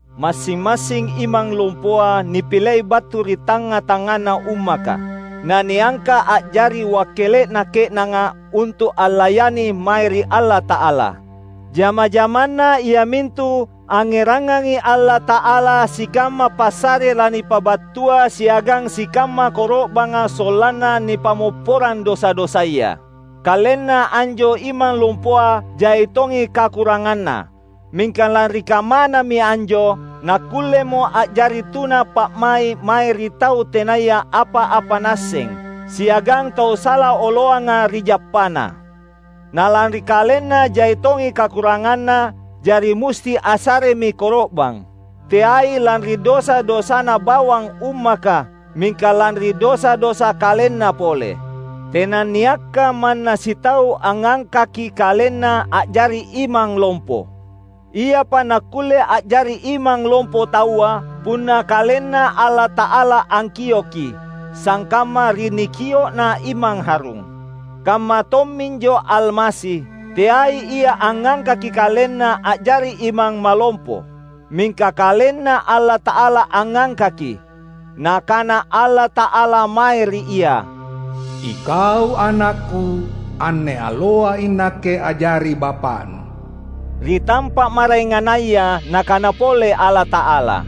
Massing-massing imang lompoa nipilei battu ri tangnga-tangngana ummaka, na niangka’ a’jari wakkele’na ke’nanga untu’ allayani mae ri Allata’ala. Jama-jamanna iamintu angngerangangi Allata’ala sikamma passare lanipabattua siagang sikamma koro’banga sollanna nipammopporang dosa-dosaya. Kalenna anjo imang lompoa jai tongi kakurangnganna; mingka lanri kammanami anjo nakkullemo a’jari tuna pa’mai’ mae ri tau tenaya apa-apa naasseng siagang tau sala oloanga ri jappana. Na lanri kalenna jai tongi kakurangnganna, jari musti assaremi koro’bang; teai lanri dosa-dosana bawang ummaka, mingka lanri dosa-dosa kalenna pole. Tenanniakka manna sitau angngangkaki kalenna a’jari imang lompo. Iapa nakkulle a’jari imang lompo taua, punna KalenNa Allata’ala angkioki — sangkamma ri nikio’na Imang Harun. Kamma tomminjo Almasi. Teai Ia angngangkaki KalenNa a’jari Imang Malompo. Mingka KalenNa Allata’ala angngangkaki. Nakana Allata’ala mae ri Ia, "IKau AnakKu; anne alloa iNakke a’jari Bapa’Nu." Ri tampa’ maraengannaya Nakana pole Allata’ala,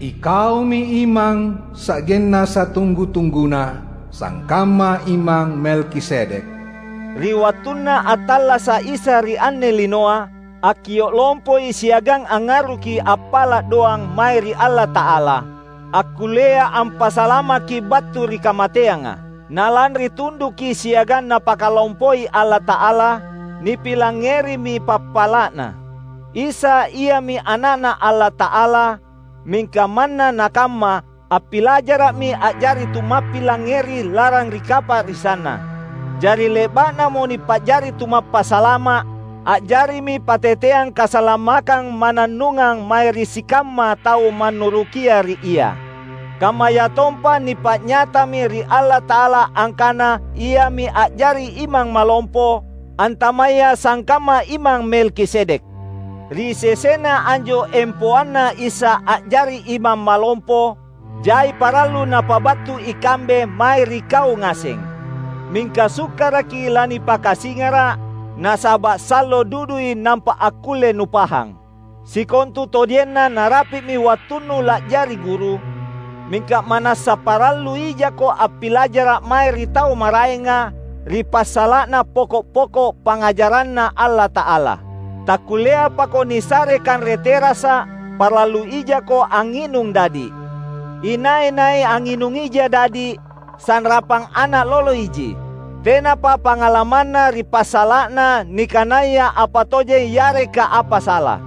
"IKaumi Imang sa’genna satunggu-tungguna, sangkamma Imang Melkisedek." Ri wattunna attallasa’ Isa ri anne linoa, akkio’ lompoi siagang angngarruki appala’ doang mae ri Allata’ala, akkullea ampasalamaki battu ri kamateanga. Na lanri tunduki siagang Napakalompoi Allata’ala, nipilangngerimi pappala’Na. Isa Iami Ana’Na Allata’ala; mingka manna nakamma, appilajara’mi a’jari tu mappilangngeri lalang ri kapa’risanNa. Jari ri le’ba’namo nipa’jari Tumappasalama’, a’jarimi patteteang kasalamakkang mannannungang mae ri sikamma tau mannurukia ri Ia; kammayatompa nipa’nyatami ri Allata’ala angkana Iami a’jari Imang Malompo, antamaya sangkamma Imang Melkisedek! Ri sesena anjo empoanna Isa a’jari Imang Malompo, jai parallu napabattu ikambe mae ri kau ngaseng; mingka sukkaraki lanipakasingara’, nasaba’ sallo dudui nampa akkulle nupahang. Sikontutojenna narapi’mi wattunnu la’jari guru; mingka ma’nassa parallu ijako appilajara’ mae ri tau maraenga ri passala’na poko’-poko’ pangngajaranNa Allata’ala. Takkullea pako nisare kanre terasa’; parallu ijako angnginung dadi’. Inai-nai angnginung ija dadi’, sanrapang ana’ lolo iji; tenapa pangalamanna ri passala’na nikanaya apa tojeng yareka apa sala.